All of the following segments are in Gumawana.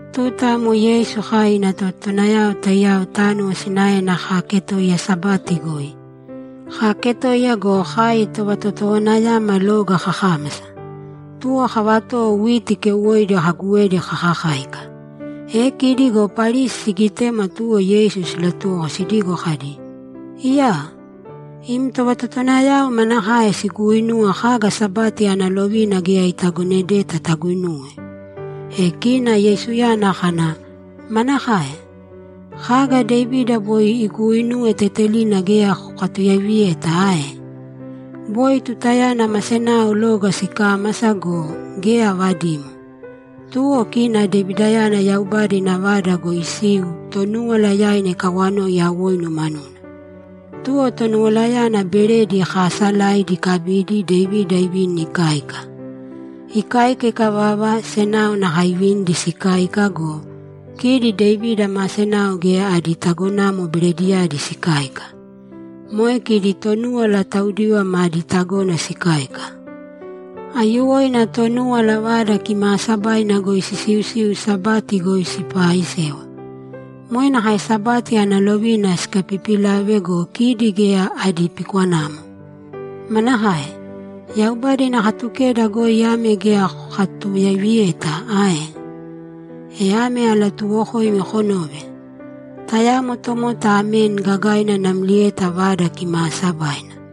Tuta amo Yeisu kai ina tovatotowanayao taiyao tánuwo sinaena kaaketoiya Sabati goi. Kaaketoiya go, kai tovatotowanayama loga kakámasa. Tuwo kavatowo witi keuwoidi kaguwedi kakakáika. E kidi go Parisi sigitema, tuwo Yeisu silatuwoko sidigo kadi, ‘Iyaa! Im tovatotowanayao manakae siguuinuwa kaga Sabati ana lovina geya itagonedeta taguinuwe?’ E kina Yeisuyana kana, ‘Manakae? Kaga Devida boi iguuinuwe tetelina geya kokatuyaiviyeta ae? Boi tutayana ma senao loga sikámasa go, geya avadimo. Tuwo kina Devidayana Yaubada ina Vada goi isiu, Tonúwala yaina ikawanoi awoinu manuna. Tuwo Tonuwalayana beredi kaasalaidi ikabidi, Devida ivini ikáika. Ikáika ikavava, senao nakae ivinidi sikáika go, kidi Devida ma senao geya adi tagonamo berediyadi sikáika. Moe kidi Tonúwala taudiva madi tagona sikáika. Aiyuwoina Tonúwala Vada Kimaasabaina goi sisiusiu Sabati goi sipaaisewa. Moe nakae Sabati ana lovina sikapipilave go, kidi geya adi pikwanamo. Manakae? Yaubada ina Katukeda goi ame geya kokatuyaiviyeta ae? E ame alatuuwokoimi konōve: Tayamo tomota ameni gagaina namlieta Vada Kimaasabaina.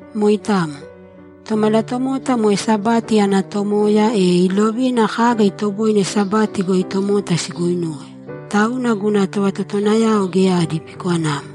Moitamo. Tomalatomota moe Sabati ana Tomoya, e ilovina kaga itoboine Sabati goi tomota siguinuwe, tauna guna tovatotowanayao geya adi pikwanamo.’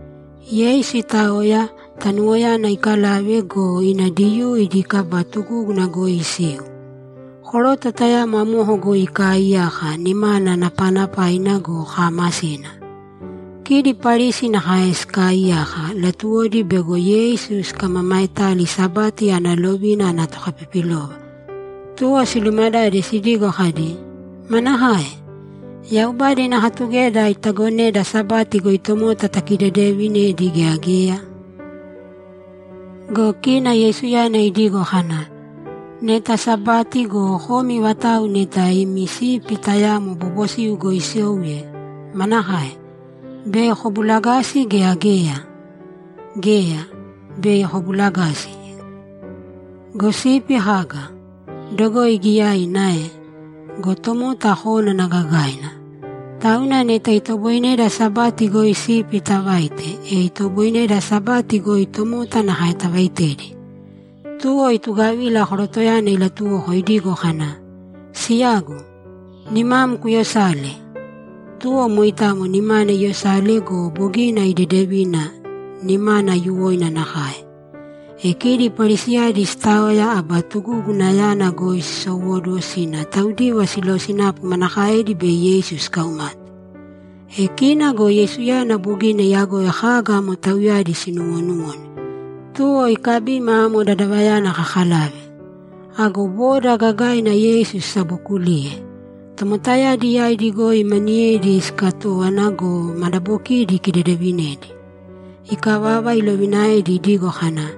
Yeisu itaoya, tanuwoyana ikalave go, ina Diyuu idi kaba tugúguna goi isiu. Koroto tayamo amoko goi ikaaiyaka, nimana napanapaina go, kaamasina. Kidi Parisi nakae sikaaiyaka; latuwodi bego Yeisu sikamamaetali Sabati ana lovina ana tokapipilova, tuwo silumadade sidigo kadi, ‘Manakae? Yaubada ina Katukeda itagoneda Sabati goi tomota takidedevinedi gea geya?’ Go kina Yeisuyana idigo kana, ‘Neta Sabati go, komi vatauwa neta imi sipi tayamo bobosiu goi isouye, manakae? Bei kobulagasi, gea geya? Geya, bei kobulagasi. Go sipi kaga? Dogoi giyaina ae? Go tomota kónana gagaina. Tauna neta itoboineda Sabati goi sipi tavaite, e itoboineda Sabati goi tomota nakae tavaitedi.’ Tuwo itugavila korotoyana ilatuwoko idigo kana, ‘Siyagu, nimam kuyosāle!’ Tuwo moitamo nimana iyosale go, bogina idedevina, nimana aiyuwoina nakae. E kidi Parisiyadi sitaoya, aba tugugunayana goi sisowóduwo sina taudiva silosinapu manakaedi bei Yeisu sikaumate. E kina go Yeisuyana bogina iyagoi kaga amo tauyadi sinuwonuwone, tuwo ikabima amo dadavayana kakalave. Ago boda gagaina Yeisu sisabokuliye. Tomotayadi yaidi goi maniyedi sikatówana go, madabokidi ikidedevinedi. Ikavava, ilovinaedi idigo kana,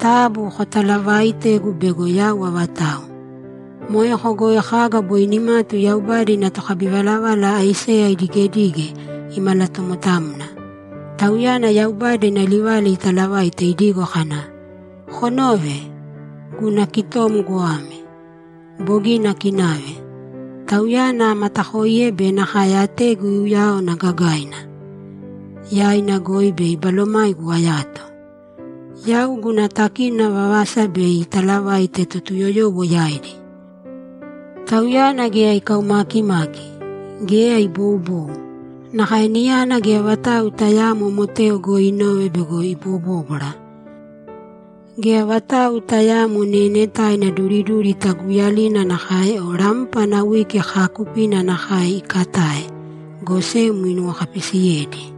‘Taabu kotaalavāita bego yau avatau.’ Moeko goi kaga boi nimatu Yaubada ina tokabivalavala Aiseya idigedige, imalatomotamna. Tauyana Yaubada ina livala italavaite idigo kana, ‘Konōve! Guna kitom goame. Bogina akinave. Tauyana amatakoiye be nakae ategu iuyaone gagaina. Yaina goi bei Balomaigu ayato. Yau guna takínona vavasa bei italavaite Totuyoyowo yaidi. Tauyana geya ikaumakimaki. Geya iboubou. Nakae niyana geya vatau tayaamo moteo goi inove bego ibobóbwara. Geya vatau tayaamo neenetaina duriduri taguuyalina nakae o rampa ana wiki kaakupina nakae ikatae, go sem inuwokapisiyedi.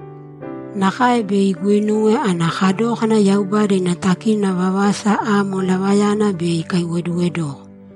Nakae bei iguinuwe ana kadókana Yaubada ina takínona vavasa amo lavayana bei ikaiwoduwedoko.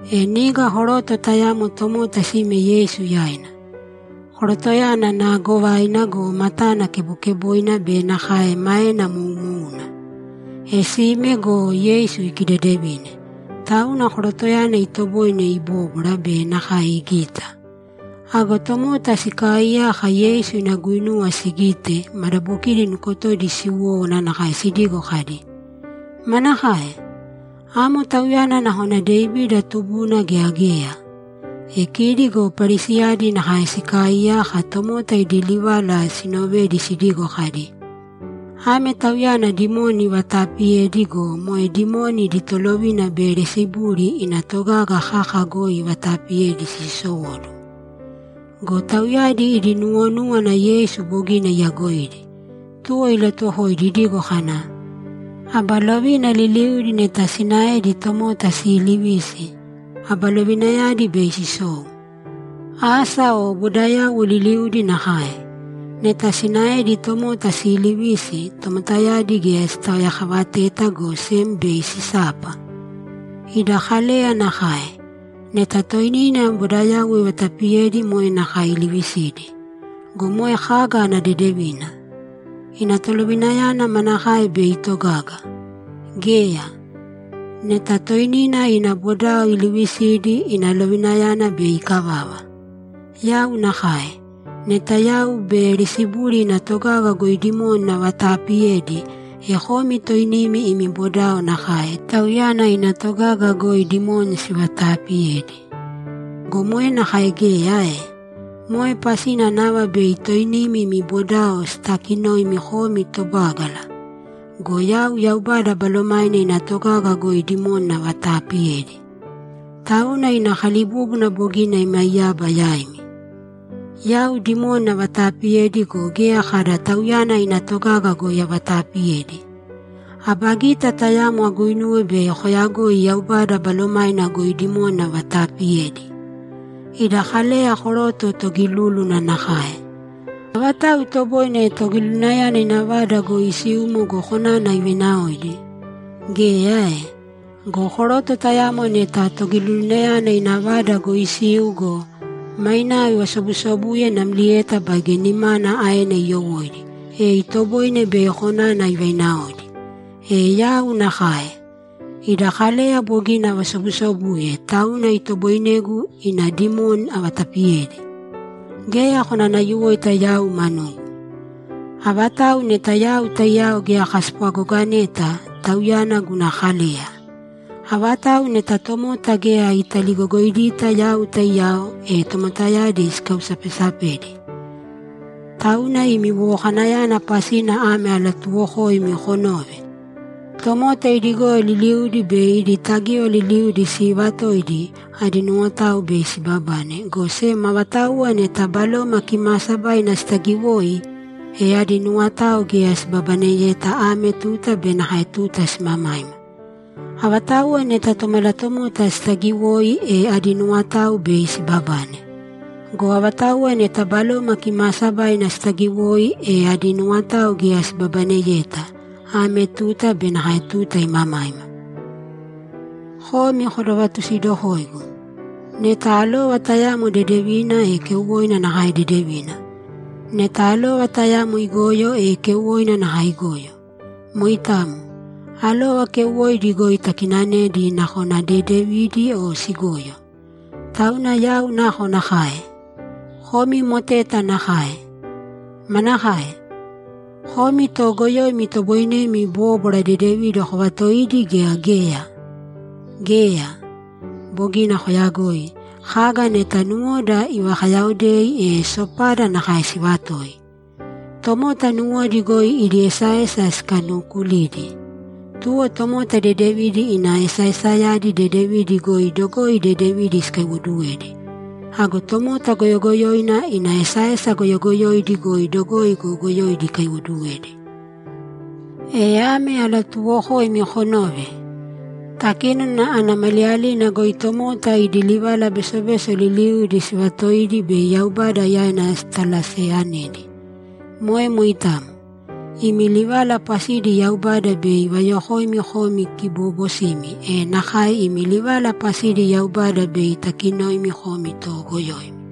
E niga koroto tayamo tomota sime Yeisu yaina. Korotoyana naagovaina go, matana kebokeboina be nakae maena moumouna. E sime go, Yeisu ikidedevine, tauna korotoyana itoboine ibóbwara be nakae igita. Ago tomota sikaaiyaka Yeisu ina guinuwa sigite, madabokidi nukotodi siwówana nakae sidigo kadi, ‘Manakae? Amo tauyana nakona Devida tubuna gea geya?’ E kidi go Parisiyadi nakae sikaaiyaka, tomota idi livala sinovedi, sidigo kadi, ‘Ame tauyana dimoni ivataapiyedi go, moe dimoni idi tolovina Beyelisebuli ina togaga kaka goi ivataapiyedi siisowóduwo.’ Go tauyadi idi nuwonúwana Yeisu bogina iyagoidi, tuwo ilatuwokoidi idigo kana, ‘Aba lovina liliudi neta sinaedi tomota siilivisi, aba lovinayadi bei sisou. Asa o bodayauwo liliudi nakae. Neta sinaedi tomota siilivisi, tomotayadi geya sitaoyakavateta, go sem bei sisapa. Ida Kaleya nakae. Neta toinina ina bodao ivatapiyedi, moe nakae ilivisidi. Go moe kaga ana dedevina? Ina lovinayana manakaena bei itogaga? Geya! Neta toinina ina bodao ilivisidi, ina lovinayana bei ikavava. Yau nakae. Neta yau Beyelisebuli ina togaga goi dimoni avataapiyedi, e komi toinimi imi bodao nakae, tauyana ina togaga goi dimoni sivataapiyedi. Go moe nakae geya ae? Moe pasina nava bei toinimi imi bodao sitakinoimi komi tobágala. Go yau Yaubada Balomaina ina togaga goi dimoni avataapiyedi, tauna ina kalibúbuna bogina imaiyaba yaimi. Yau dimoni avataapiyedi go, geya kada tauyana ina togaga goi avataapiyedi. Aba gita tayamo aguinuwe bei koyagoi Yaubada Balomaina goi dimoni avataapiyedi. Ida Kaleya koroto togilúluna nakae. Avatau itoboine togilulunayana ina vada goi isiumo go, konana ivainaoidi? Geya ae? Go koroto tayamo neta togilulunayana ina vada goi isiu go, mainao ivasobusobuye namlieta baige nimana aena iyowóidi, e itoboine bei konana ivainaoidi. E yau nakae. Ida Kaleya bogina avasobusobuye, tauna itoboinegu ina dimoni avatapiyedi. Geya konanayuwoita yau manugu. Avatau neta yau taiyao geya kaspwagogoneta, tauyana guna kaleya. Avatau neta tomota geya italigogoidita yau taiyao, e tomotayadi ikausapesapedi. Tauna imi wowokanayana pasina ame alatuuwokoimi konōve: Tomota idi goyo liliudi be idi tagíwaya liliudi sivaatoidi, adi nuwotao bei sibabane, go sem avatauwa neta Baloma Kimaasabaina sitagiwoi, e adi nuwotao geya sibabaneyeta ame tuta be nakae tuta simamaima. Avatauwa neta Tomalatomota sitagiwoi, e adi nuwotao bei sibabane. Go avatauwa neta Baloma Kimaasabaina sitagiwoi, e adi nuwotao geya sibabaneyeta, ame tuta be nakae tuta imamaima. Komi kodovatusidokōigu. Neta alova tayamo dedevina, e keuwoina nakae dedevina. Neta alova tayamo igoyo, e keuwoina nakae igoyo. Moitamo. Alova keuwoidi goi takinanedi, nakona dedevidi o sigoyo. Tauna yau nakonakae? Komi moteta nakae! Manakae? Komi toogoyoimi itoboinemi bóbwara dedevidi kovatoidi gea geya? Geya! Bogina koyagoi. Kaga neta nuwoda ivakayaodei, e sopada nakae sivatoi. Tomota nuwodi goi idi esaesa sikanukulidi. Tuwo tomota dedevina ina esaesayadi dedevidi goi dogoi dedevidi ikaiwoduwedi. Ago tomota goyogoyoina ina esaesa goyogoyoidi goi dogoi goyogoyoidi ikaiwoduwedi. E ame alatuuwokoimi konōve: Takínona ana maliyalina goi tomota idi livala besobeso liliudi sivaatoidi bei Yaubada yaina sitalaseyanedi. Moe moitamo. Imi livala pasidi Yaubada bei ivayokoimi komi kiboobosimi, e nakae imi livala pasidi Yaubada bei itakinoimi komi toogoyoimi.’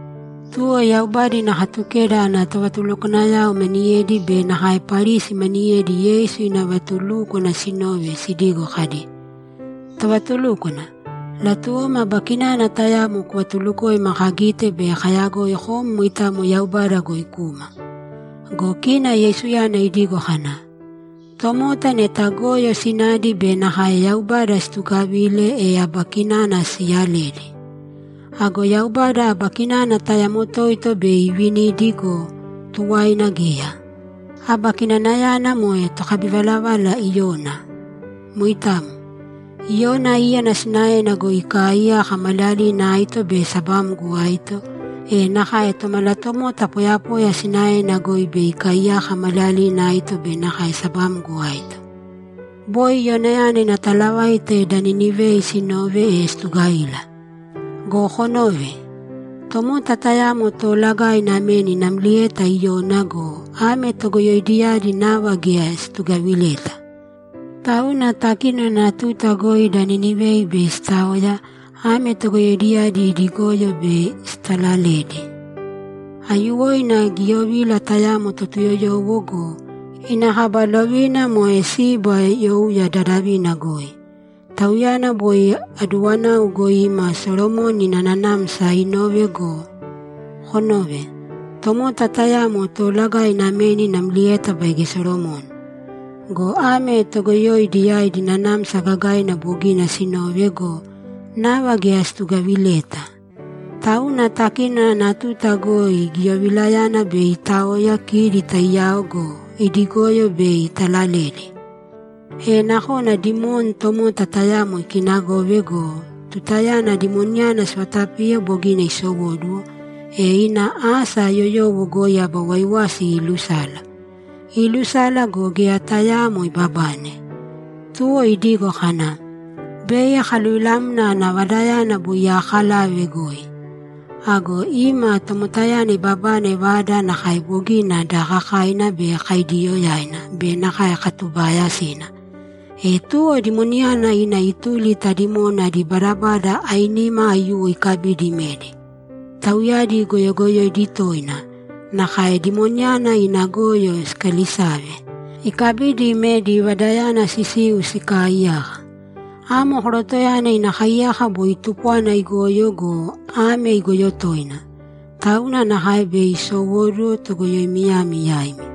Tuwo Yaubada ina Katukeda ana tovatulukwanayao maniyedi be nakae Parisi maniyedi Yeisu ina vatulúkwana sinove, sidigo kadi, ‘Tovatulúkwana, latuwoma aba kinana tayamo kuvatulukoima kagite bei kayagoi kom moitamo Yaubada goi kuma.’ Go kina Yeisuyana idigo kana, ‘Tomota neta goyo sinadi be nakae Yaubada situgavile, e aba kinana siiyaledi. Ago Yaubada aba kinana tayamo toito bei ivinidi go, tuwaina geya. Aba kinanayana moe tokabivalavala Iyona. Moitamo. Iyona íyana sinaena goi ikaaiyaka maliyalina aito be sabamgo aito, e nakae Tomalatomota poyapoya sinaena goi bei ikaiyaka maliyalina aito be nakae sabamgo aito. Boi Iyonayana ina talavaita da Ninivei sinove, e situgavila. Go konōve. Tomota tayamo toolagaina ameni namlieta Iyona go, ame togoyoidiyadi nava geya situgavileta. Tauna takínona ana tuta goi da Ninivei bei sitaoya, ame togoyoidiyadi idi goyo bei sitalaledi. Aiyuwoina giyovila tayamo Totuyoyowo go, ina kaba lovina moe Siba youya dadavina goi. Tauyana boi aduwanau goi ima Solomoni ina nanamsa inove. Go konōve. Tomota tayamo toolagaina ameni namlieta baige Solomoni. Go ame togoyoidiyadi nanamsa gagaina bogina sinove go, nava geya situgavileta. Tauna takínona ana tuta goi giyovilayana bei itaoya kidi taiyao go, idi goyo bei italaledi. E nakona dimoni tomota tayamo ikinagove go, tutayana dimoniyana sivatapiye bogina isowóduwo, e ina asa yoyowo goi aba waiwasi iilusala. Iilusala go, geya tayaamo ibabane. Tuwo idigo kana, “Bei akaluvilamna ana vadayana boi aakalave goi.” Ago ima, tomotayana ibabane vada nakae bogina daakakaina be kaidiiyoyaina be nakae katubaayasina. E tuwo dimoniyana ina ituli ta dimoni adi badabada ainima aiyuwo ikabidi imedi. Tauyadi goyogoyoidi toina, nakae dimoniyana ina goyo sikaalisave. Ikabidi, imedi vadayana sisiu sikaaiyaka. Amo korotoyana ina kaiyaka boi tupwana igoyo go, ame igoyo toina. Tauna nakae bei isowóduwo togoyoimiyami yaimi.’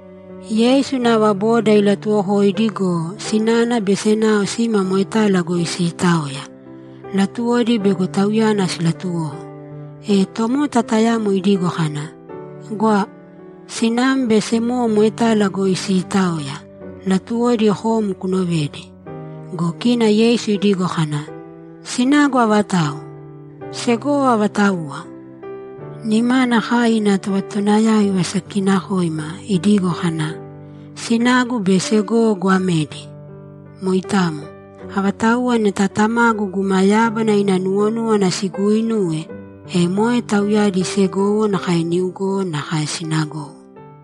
Yeisu nava boda ilatuuwokoidi go, sinana be senao sima moetala goi siitaoya; latuwodi bego Tauyana silatuwoko. E tomota tayamo idigo kana, ‘Gwa! Sinam be semowo moetala goi siitaoya; latuwodi kom kunovedi.’ Go kina Yeisu idigo kana, ‘Sinagu avatau? Segowo avatauwa?’ Nimana kai ina tovatotowanayao ivasakikinakoima, idigo kana, ‘Sinagu be segowo goamedi! Moitamo. Avatauwa neta Tamagu guma yábana ina nuwonúwana siguuinuwe, e moe tauyadi segowo nakae niugowo nakae sinagowo.’